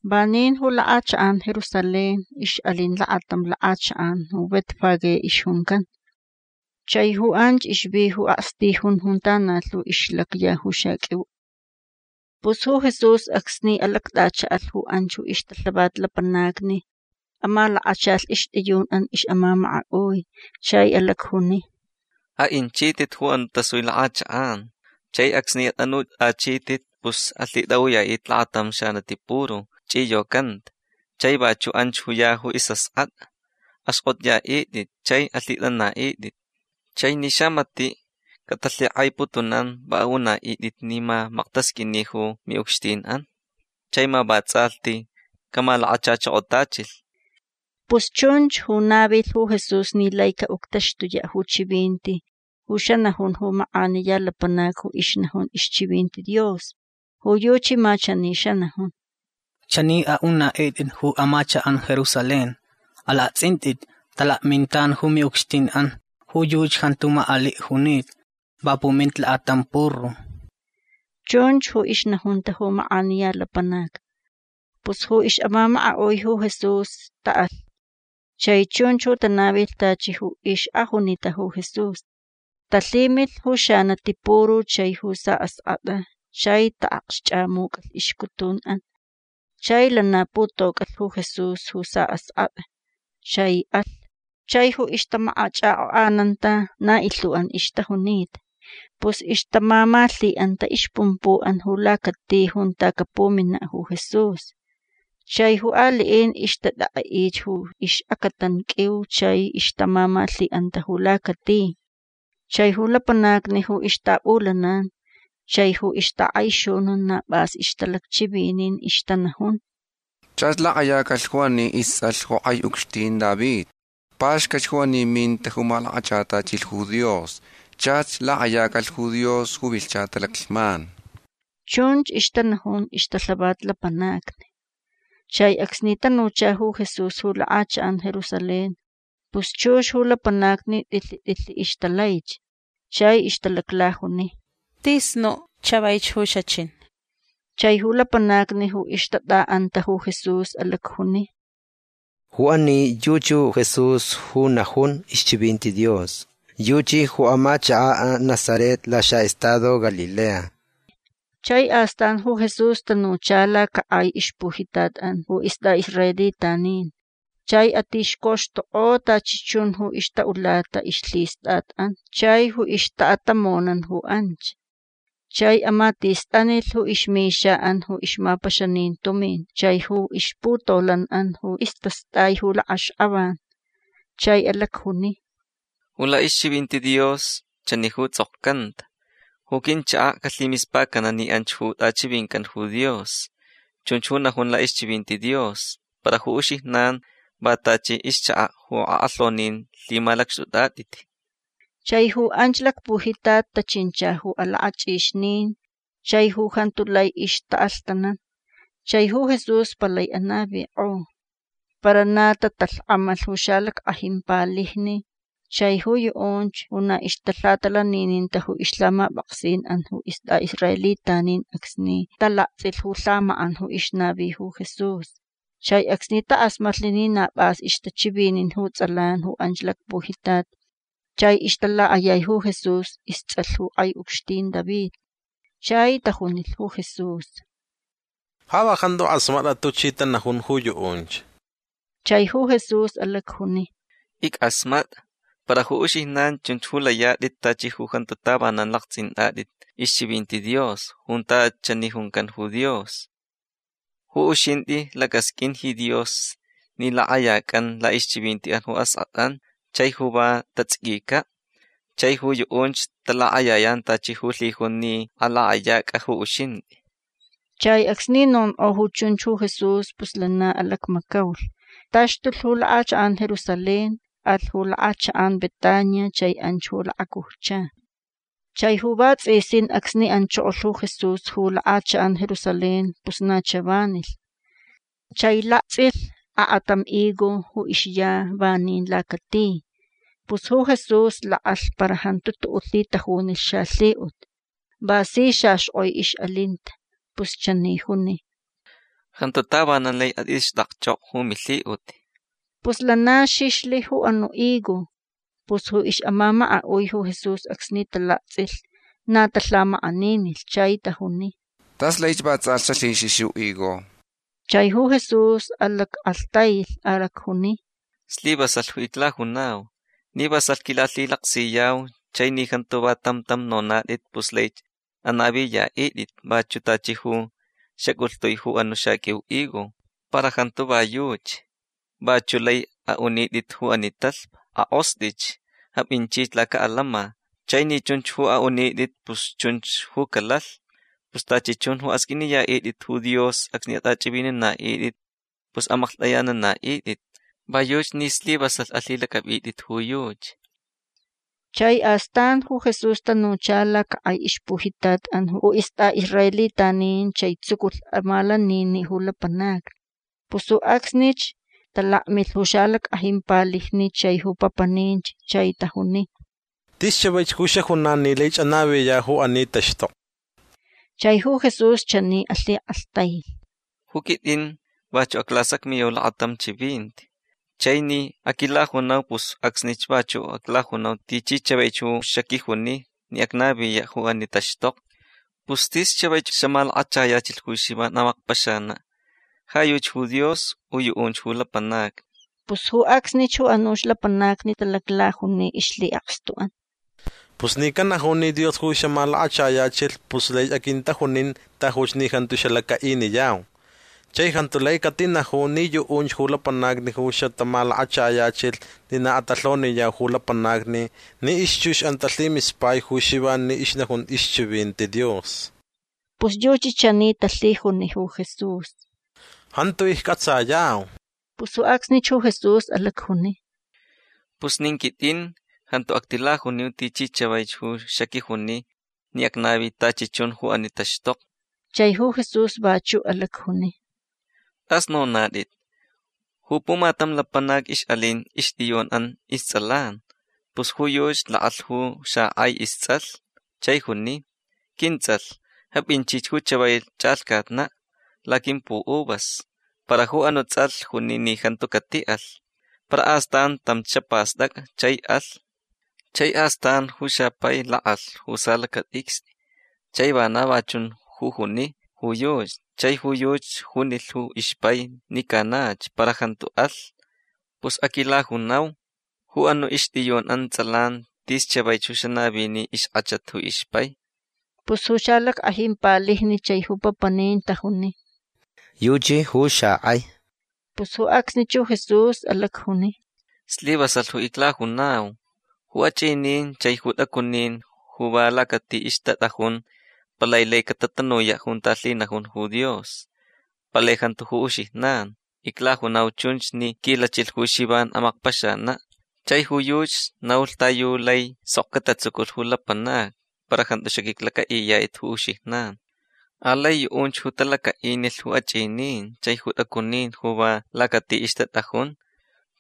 Vanin ju lak'achak'an Jerusalén ix'alin lakatam lak'achak'an ju Betfagé ixjuncan. Chai ju anch ixvi ju akstijun junta na lhu ixlacya ju xaq'uiu olivos. Pus ju Jesús acsni alact'acha'alh ju anch ju ixtalhavat lapanacni amalakachalh ixt'iyun'an ix'amamaka'ui. Chai alacjuni: ―A'inchit'it ju anu' tasui lak'achak'an. Chai acsni at'anut'achit'it pus alhit'a'uya'it'it lakatam xanati puru ch'iyocanta. Chai vachu' anch ya ju is'ask'at'a. Axk'ot'aya'it'it chai alhit'ana'it'it. Chai ni xamati' catalhik'aiputunan va a'una'it'it ni ma maktasq'uini ju mi'ucxtin'an chai ma vats'alhti camalakachachokotachilh. Pus chunch ju navilh ju Jesús ni lai ca'uctaxtuya' ju chivinti ju xanajun ju mak'aniya lapanac ju ixnajun ixchivinti Dios. Ju yuchi ma chani xanajun: Chani a'una'it'it ju amachak'an Jerusalén: “Alakts'int'it. Talakmintan ju mi'ucxtin'an. Ju yuchi jantu mak'ali' junita. Va puminta lakatam puru”. Chunch ju ixnajunta ju mak'aniya lapanac. Pus ju ix'amamaka'ui ju Jesús ta'alh. Chai chunch ju tanavilh tachi ju ix'ajunita ju Jesús. Talhimilh ju xanati puru chai ju sa'ask'at'a chai ta'akxch'amuc'alh ixcutun'an. Chai lana putoc'alh ju Jesús ju sa'ask'at'a. Chai alh. Chai ju ixtamakach'ak'ok'ananta na ilhu'an ixtajunita. Pus ixtamamalhi'anta ixpumpu'an ju lacati junta capumina' ju Jesús. Chai ju ali'in ixtat'ek'e'ich ju ix'acatan q'uiu chai ixtamamalhi'anta ju lacati. Chai ju lapanacni ju ixtap'ulanan chai ju ixtak'aixunun na p'as ixtalacchivinin. Ixtanajun: ―Chach lak'ayacalh ju ani ists'alh ju k'ai ucxtin David. Paxcat ju ani minta ju malakachatachilh ju Dios. Chach lak'ayacalh ju Dios ju vilhcha talaclhman. ―Chunch ixtanajun ixtalhavat lapanacni. Chai acsni tanucha ju Jesús ju lak'achak'an Jerusalén pus chux ju lapanacni t'ilhi t'ilhi ixtalaich. Chai ixtalaclajuni: ―Tis nu' chavaich ju xachin. Chai ju lapanacni ju ixtat'a'anta ju Jesús alacjuni: ―Ju ani yuchi ju Jesús ju najun ixchivinti Dios. Yuchi ju amachaka' Nazaret laxa'estado Galilea. Chai astan ju Jesús tanucha lacak'ai ixpujitat'an ju ist'a'israelitanin. Chai atixcoxtuk'o tachi chun ju ixta'ulata ixlhist'at'an chai ju ixta'atamonan ju anch. Chai amatistanilh ju ixmixa'an ju ixmapaxanin tumin chai ju ixputolan'an ju istast'ai ju lak'axk'avan. Chai alacjuni: ―Ju la'ixchivinti Dios chani ju ts'okcanta: “Ju quinchaka' calhimispacana' ni anch ju t'achivincan ju Dios”. Chunch ju najun la'ixchivinti Dios. Para ju uxijnan va tachi ixchaka' ju ak'alhaunin lhimalacxt'ut'at'it. Chai ju anch lacpujitat tachincha ju alak'ach'ixnin chai ju jantu lai ixta'alhtanan. Chai ju Jesús palai anavik'o. Para na tatalhk'amalh ju xalack'ajin palijni chai ju yu'unch ju na ixtalhatalanininta ju ixlhamap'aksin'an ju ist'a'israelitanin acsni talakts'ilh ju lhamak'an ju ixnavi ju Jesús chai acsni tak'asmatlh ni na p'as ixtachivinin ju ts'alan ju anch lacpujitat chai ixtalak'ayai ju Jesús ists'alh ju k'ai ucxtin David. Chai tajunilh ju Jesús: ―Ja va jantu k'asmat'a tuchi tanajun ju yu'unch. Chai ju Jesús alacjuni: ―Ick'asmat'a. Para ju uxijnan chunch ju layat'it tachi ju jantu tavanan lakts'int'at'it ixchivinti Dios junta chani juncan ju Dios: Ju uxint'i lac'asq'uin ji Dios ni lak'ayac'an la'ixchivinti'an ju ask'at'an chai ju va tats'iquica'. Chai ju yu'unch talak'ayayan tachi ju lhijun ni alak'ayac'a ju uxint'i. Chai acsni nonk'o ju chunch ju Jesús pus lana alacmacaulh. Taxtulh ju lak'achak'an Jerusalén. Alh ju lak'achak'an Betania chai anch ju lakacujcha. Chai ju vats'isin acsni anchokolh ju Jesús ju lak'achak'an Jerusalén pus na chavanilh. Chai lakts'ilh ak'atam higo ju ixya vanin lacati. Pus ju Jesús lak'alh para jantu tu'u' lhitajunilh xalhi'ut. Va si xaxk'oi ix'alinta. Pus chani juni: ―Jantu tavanan lai at'ixt'akch'ok'o ju milhi'ut. Pus lana xixlh ju anu' higo. Pus ju ix'amamaka'ui ju Jesús acsni talakts'ilh na talhamak'aninilh. Chai tajuni: ―Tas laich va ts'alhti xalhixix ju higo. Chai ju Jesús alack'alhtailh. Alacjuni: ―Slivasalh ju iclajunau. Ni vasalh quilalhilaksiyau chai ni jantu va tam tam nonat'it pus laich anaviya'it'it vachu' tachi ju xac'ulhtui ju anu' xaq'uiu higo. Para jantu va yuchi. Vachu' lai a'unit'it ju ani talhpa: “Ak'ost'ich. Ap'inchich laca'alama”. Chai ni chunch ju a'unit'it pus chunch ju calalh. Pus tachi chun ju asq'uiniya'it'it ju Dios acsni at'ach'ivinina'it'it pus amaklht'ayanana'it'it. Va yuchi ni slivasalh alhilac'ap'it'it ju yuchi. Chai astan ju Jesús tanucha lacak'ai ixpujitat'an ju ist'a'israelitanin chai tsuculh amalanini' ju lapanacni. Pus ju acsnich talakmilh ju xalack'ajin palijni chai ju papaninch chai tajuni: ―Tis chavaich ju xajunan ni laich anaviya' ju ani taxtokni. Chai ju Jesús chani alhik'alhtailh: ―Ju quit'in vachu' aclasacmiyau lakatam chivinti. Chai ni aquilajunau pus ju acsnich vachu' aclajunau tichi chavaich ju xaquijuni ni acnaviya' ju ani taxtokni. Pus tis chavaich ju xamalakachayachilh ju Xivan amakpaxana'. Ja yuchi ju Dios u yu'unch ju lapanacni. Pus ju acsnich ju anuch lapanacni talaclajuni ixlhi'akstu'an: ―Pus ni canaju ni Dios ju xamalakachayachilh pus laich aquintajunin tajuch ni jantu xalaca'iniyau. Chai jantu lai catinaju ni yu'unch ju lapanacni ju xatamalakachayachilh ni na atalhoniyau ju lapanacni ni ixchux'an talhimispai ju Xivan ni ixnajun ixchivinti Dios. Pus yuchi chani talhijuni ju Jesús: ―Jantu icc'atsayau. Pus ju acsnich ju Jesús alacjuni: ―Pus nin quit'in jantu actilajuniu tichi chavaich ju xaquijuni ni acnavi tachi chun ju ani taxtokni. Chai ju Jesús vachu' alacjuni: ―T'as nonat'it. Ju pumatam lapanac ix'alin ixt'iyun'an ists'alan. Pus ju yuchi lak'alh ju xak'ai ists'alh chai juni: “Quints'alh. Ap'inchich ju chavai ch'alhcatna' laquimpu'uvas”. Para ju anu' ts'alh juni ni jantu cati'alh. Para astan tamch xapast'ac'a chai alh. Chai astan ju xapai lak'alh ju salacat'icst'i chai vana va chun ju juni ju yuchi. Chai ju yuchi junilh ju ixpai ni canach. Para jantu alh. Pus aquilajunau. Ju anu' ixt'iyun'an ts'alan tis chavaich ju xanavini ixk'achat ju ixpai. Pus ju xalack'ajin palijni chai ju papanin tajuni: ―Yuchi ju xak'ai. Pus ju acsnich ju Jesús alacjuni: ―Slivasalh ju iclajunau. Ju ach'inin chai ju t'acunin ju va lacati ixtat'ajun palai lai catatanuya' junta lhinajun ju Dios. Palai jantu ju uxijnan. Iclajunau chunch ni quilachilh ju Xivan amakpaxana'. Chai ju yuchi naulh ta yu laich sok catatsuculh ju lapanacni para jantu xaq'uiclac'a'iyat'it ju uxijnan. Alai yu'unch ju talaca'inilh ju ach'inin chai ju t'acunin ju va lacati ixtat'ajun.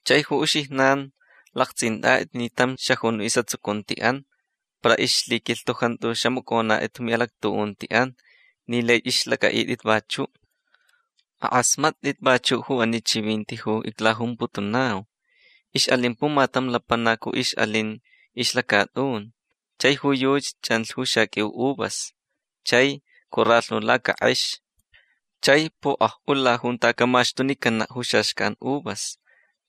Chai ju uxijnan lakts'int'at'it ni tam xajun is'atsucunti'an para ixlaquilhtu jantu xamac'onat'it ju mi'alactu'unti'an ni laich ixlac'a'it'it vachu'. Ak'asmat'it vachu' ju ani chivinti ju iclajumputunau. Ix'alin pumatam lapanac ju ix'alin ixlacat'un. Chai ju yuchi ch'anlh ju xaq'uiu uvas. Chai coralhnu lacak'ex. Chai pok'aj'ula junta camaxtunicana' ju xaxcan uvas.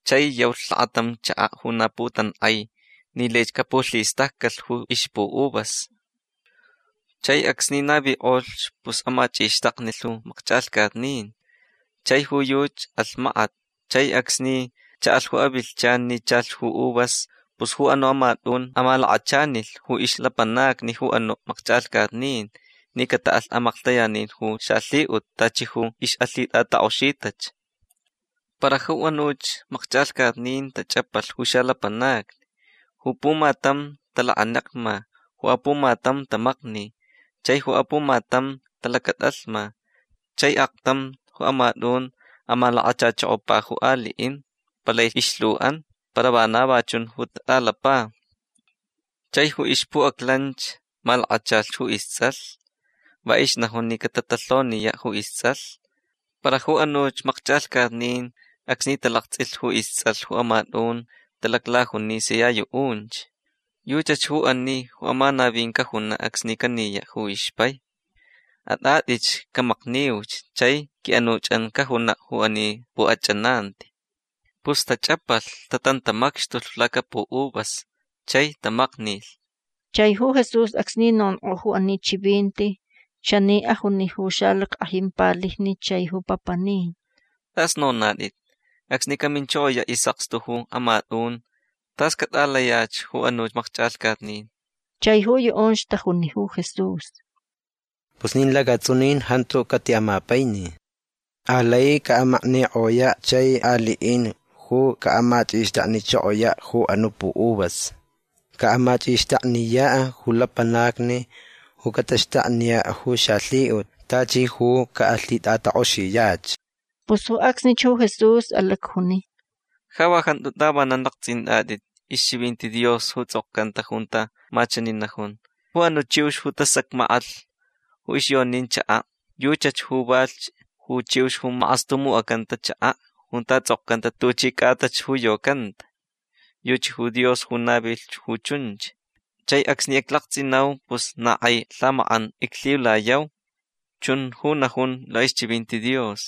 Chai yaulh lakatam chaka' ju na putank'ai ni laich capulhistaccalh ju ixpu'uvas. Chai acsni navik'olh pus amach'ixtaknilh ju makch'alhcatnin. Chai ju yuchi alh makat. Chai acsni cha'alh ju avilhchan ni chalh ju uvas pus ju anu' amat'un amalakachanilh ju ixlapanacni ju anu' makch'alhcatnin ni cata'alh amaklhtayanin ju xalhi'ut tachi ju ix'alhit'atak'oxitach. Para ju anuch makch'alhcatnin tach'apalh ju xalapanacni. Ju pumatam talakanekma. Ju apumatam tamakni. Chai ju apumatam talacat'alhma. Chai aktam ju amat'un amalakachachokopa ju ali'in. Palai ilhu'an. Para vana va chun ju tat'alapa. Chai ju ixpu'aclanch malakachalhch ju ists'alh. Va ixnajun ni catatalhoniya' ju ists'alh. Para ju anuch makch'alhcatnin acsni talakts'ilh ju ists'alh ju amat'un talaclajuni sia yu'unch: “Yuchach ju ani ju amanavin cajuna' acsni caniya' ju ixpai. At'at'itch. Camakniuch chai qui'anuch'an cajuna' ju ani pu'ach'ananti”. Pus tach'apalh. Tatantamacxtulh lacapu'uvas. Chai tamaknilh. Chai ju Jesús acsni nonk'o ju ani chivinti chani ajuni ju xalack'ajin palijni chai ju papanin: ―T'as nonat'it. Acsni caminchokoya' is'akstu ju amat'un tas cat'alayach ju anuch makch'alhcatnin. Chai ju yu'unch tajuni ju Jesús: ―Pus nin lacats'unin jantu cati'amapaini. Alai ca'amaknik'oya' chai ali'in ju ca'amach'ixtaknichokoya' ju anu' pu'uvas. Ca'amach'ixtakniya' ju lapanacni ju cataxtakniya' ju xalhi'ut tachi ju ca'alhit'atak'oxiyach. Pus ju acsnich ju Jesús alacjuni: ―Ja va jantu tavanan lakts'int'at'it ixchivinti Dios ju ts'okcanta junta ma chani najun: Ju anu' chiux ju tasacmak'alh ju ixyonin chaka' yuchach ju valhch ju chiux ju mak'astumuc'acanta chaka' junta ts'okcanta tuchi c'atach ju yocanta. Yuchi ju Dios ju navilh ju chunch. Chai acsni iclakts'inau pus na k'ai lhamak'an iclhiulayau. Chun ju najun la'ixchivinti Dios.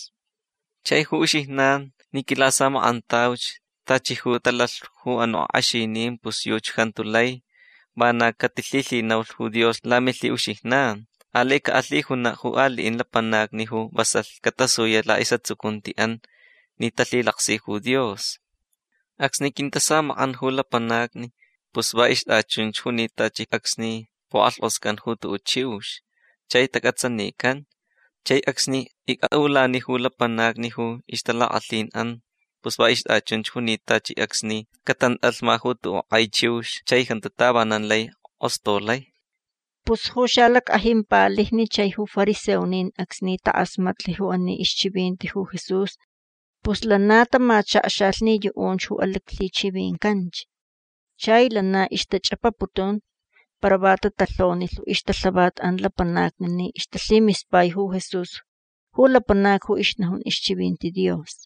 Chai ju uxijnan ni quilasamak'antauch tachi ju talalh ju anu' ak'exinin pus yuchi jantu lai vana catilhilhinaulh ju Dios lamilhi'uxijnan. Alai ca'alhijuna' ju ali'in lapanacni ju vasalh catasuya' la'is'atsucunti'an ni talhilaksi ju Dios. Acsni quintasamak'an ju lapanacni pus va ixt'achunch junita tachi acsni puk'alhk'oscan ju tu'u' chiux chai tac'atsanican. Chai acsni ic'a'ulani ju lapanacni ju ixtalak'alhin'an pus va ixt'achunch junita tachi acsni catant'alhma ju tu'u' k'ai chiux chai jantu tavanan lai k'ostolai. Pus ju xalack'ajin palijni chai ju fariseonin acsni tak'asmatlh ju ani ixchivinti ju Jesús pus lana tamachakxalh ni yu'unch ju alhichivincanch. Chai lana ixtach'apaputun. Para va tatalhonilh ju ixtalhavat'an lapanacni ni ixtalhimispai ju Jesús ju lapanac ju ixnajun ixchivinti Dios.